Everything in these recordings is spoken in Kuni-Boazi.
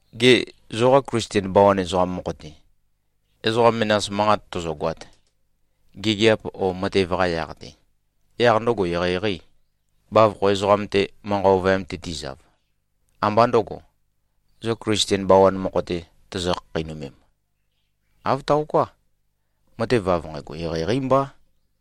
Gê, zoqa Klisten bawan ezoqam mokho-te, ezoqa menas manqat tøzøgoat, gigiap o matev-qa yaq-te, yaq ndøgo eqeieqeî, bavokho ezoqam-te manqa ovøyam-te tizav, ambā ndøgo, zo Klisten bawan mokho-te tozo-khakheinømem? Āv taoká. Matev av nqægo, eqeieqeí mbá.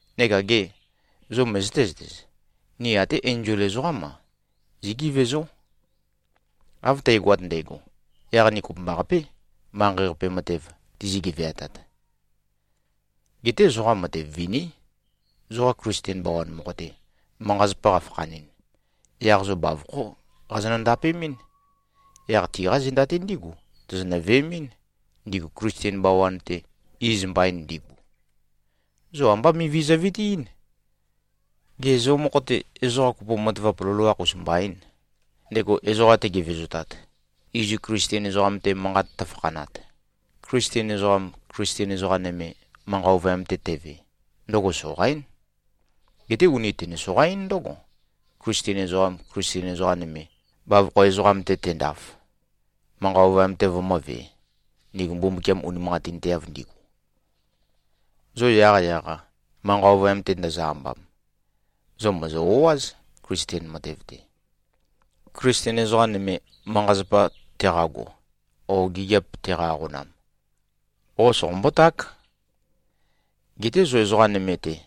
Neka gê, zo møzøté-zøtez? Ni até enzol ezoqám-a, zígevezó. Av tægoat ndægo, yaq ni kopømbaqapé, manqei-qape matev tizi-geveatat. Geté zoqa matev viní. Zoqa Klisten bawan mokho-te, manqa-zapa qafakhanɨn, yaq zo bavokhó qazonø-ndapemɨ́n. Yaq tiqa zenda-te ndígu tozonø-veemɨ́n, ndigu Klisten bawan-te iz mbain ndigu? Zo ambá mivi zøvitiín. Gê, zo mokho-te, ezoqa kopo matavap loloakh-us mbaîn, ndego ezoqa tegevezotat, izu Klisten ezoqam-te manqat tøfakhanat? Klisten ezoqam, Klisten ezoqa nøme, manqa ovøyam-te teve, ndøgo soqaín. Geté uni tøne-soqa-ín ndǿgo, Klisten ezoqam, Klisten ezoqa nøme, bavokho ezoqam-te tendaf, manqa ovøyam-te vømǿvē, ndigu Mbumbukiam unimanqatinteav ndigu. Zo yaqyaq-a, manqa ovøyam-te ndozo-ambam, zo mòzo-o꞉áz, Klisten matev-te. Klisten ezoqa nøme, manqa-zapa teqago o gigiap teqa-aqonam, qo soqombó-ták. Geté zo ezoqa nøme-te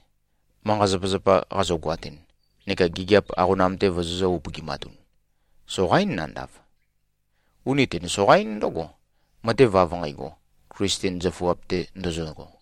manqa-zapazapa qazogoatun neka gigiap aqonam-te vozozø̄-upøgimatun, soqaín nandav. Uni tøne-soqa-ín ndǿgo, matev av nqægo, Klisten zøfuap-te ndozogo.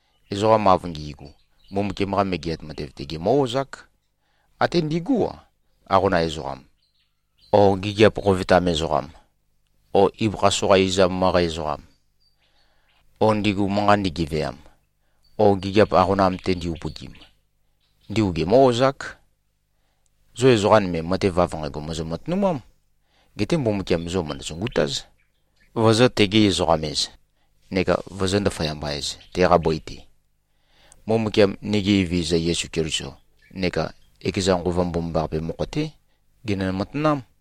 ezoqam av ngi꞉gu, Mbumbukiam-qa Megeat Matev-te gemǿ-ozák. Até ndigú-a, aqonam ezoqam, o gigiap qovetam ezoqam, o ibøkha soqa izam møqæ ezoqam, o ndigu manqa ndigeveam, o gigiap aqonam-te ndi-upøgim, ndigu gemǿ-ozák. Zo ezoqa nøme, matev av nqægo mòzo-matønumám. Geté Mbumbukiam zo mø̀ndø-sungutáz, vozō-tegi-ezoqam-ez neka vozó-ndaføyamba-ez, teqa bøi-te. Mbumbukiam, nigi Evezøza Yesu Keliso neka ekeza Nqova Mbomambaqape mokho-té genø-matanám.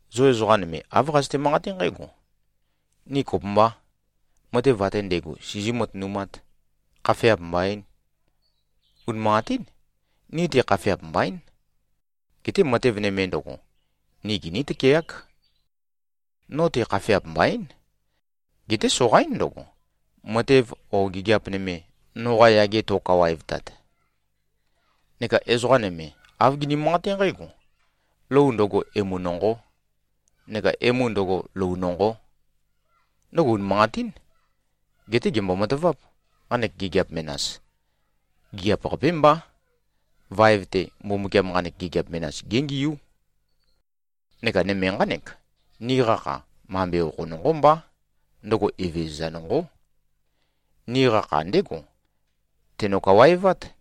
⌞Zo ezoqa nøme, āv qazøte-manqaté nqǽgo,⌟ “Ni kopømbá. Matev ate ndægo sizí-matønumát. Khafeap mbaín.” Unimanqatín. Ni-te khafeap mbaín. Geté matev nøme ndøgo, ni giní-tøkeák. No-te khafeap mbaín. Geté soqaín ndøgo, matev o gigiap nøme, noqa yage to꞉kawaevtat. ⌞Neka ezoqa nøme, āv gini-manqaté nqǽgo,⌟ “Lou ndøgo, emu nonqó. Neka emu ndøgo, lou nonqó.” Ndøgo unimanqatín. Geté gèmbo-mataváp. Nqanek gigiap menas, gigiap-qapé mbá. Vaev-te, Mbumbukiam nqanek gigiap menas géngiú. Neka nøme nqánek: Niqa kha, mambe okho nonqó mbá. Ndøgo Evezøza nonqó. Niqa kha ndégo teno-kawaevát.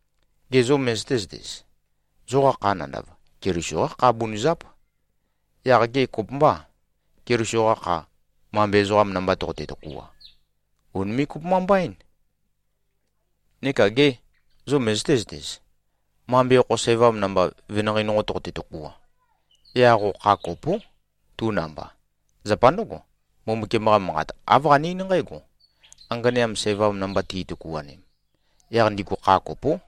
Gê, zo møzøté-zøtez? Zoqa kha nandav, Keliso-qá kha bunøzáp. Yaq gê, kopømbâ, Keliso-qa kha, mambe ezoqa namba toqote-tøkua? Ùnime꞉-kopømba-mbaín. Neka gê, zo møzøté-zøtez? Mambe okho sævam namba, venanqei nonqo toqote-tøkua, yaq qo kha kopó, tu namba. Zapa ndǿgo, Mbumbukiam-qa Manqat, āv qane-eín nqǽgo: Anganeam sævam namba ti꞉tøkuanem, yaq ndigu kha kopó.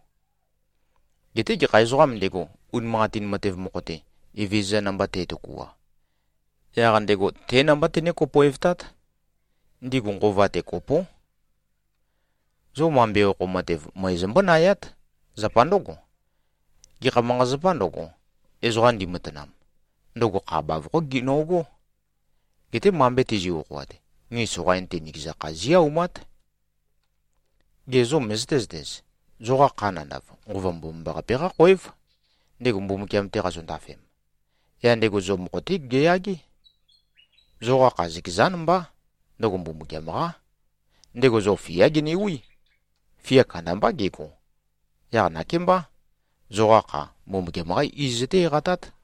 Geté gekha ezoqām ndego, unimanqatin matev mokho-te, Evezøza namba te꞉tøkua, yaq ndego té namba tené-kopoevtát. Ndigu nqova-te, kopó. Zo mambe okho matev møe zombónayát. Zapa ndǿgo, gekha manqa-zapā ndøgo, ezoqa ndimatanam, ndøgo kha bavokhó gino꞉gó. Geté mambe tizi꞉-okhoat, ni soqain-te, nikeza kha zí-aumát. Gê, zo møzøté-zøtez? Zoqa kha nandav, Nqova Mbomambaqape-qá khoév, ndego Mbumbukiam-te qazondafem. Yaq ndego zo mokho-té geyagé. Zoqa kha, zøkezán mbá. Ndøgo Mbumbukiam-qá. Ndego zo fiá genewí. Fia kandambá gego. Yaq nakémbá, zoqa kha, Mbumbukiam-qá iz zøté-eqatát.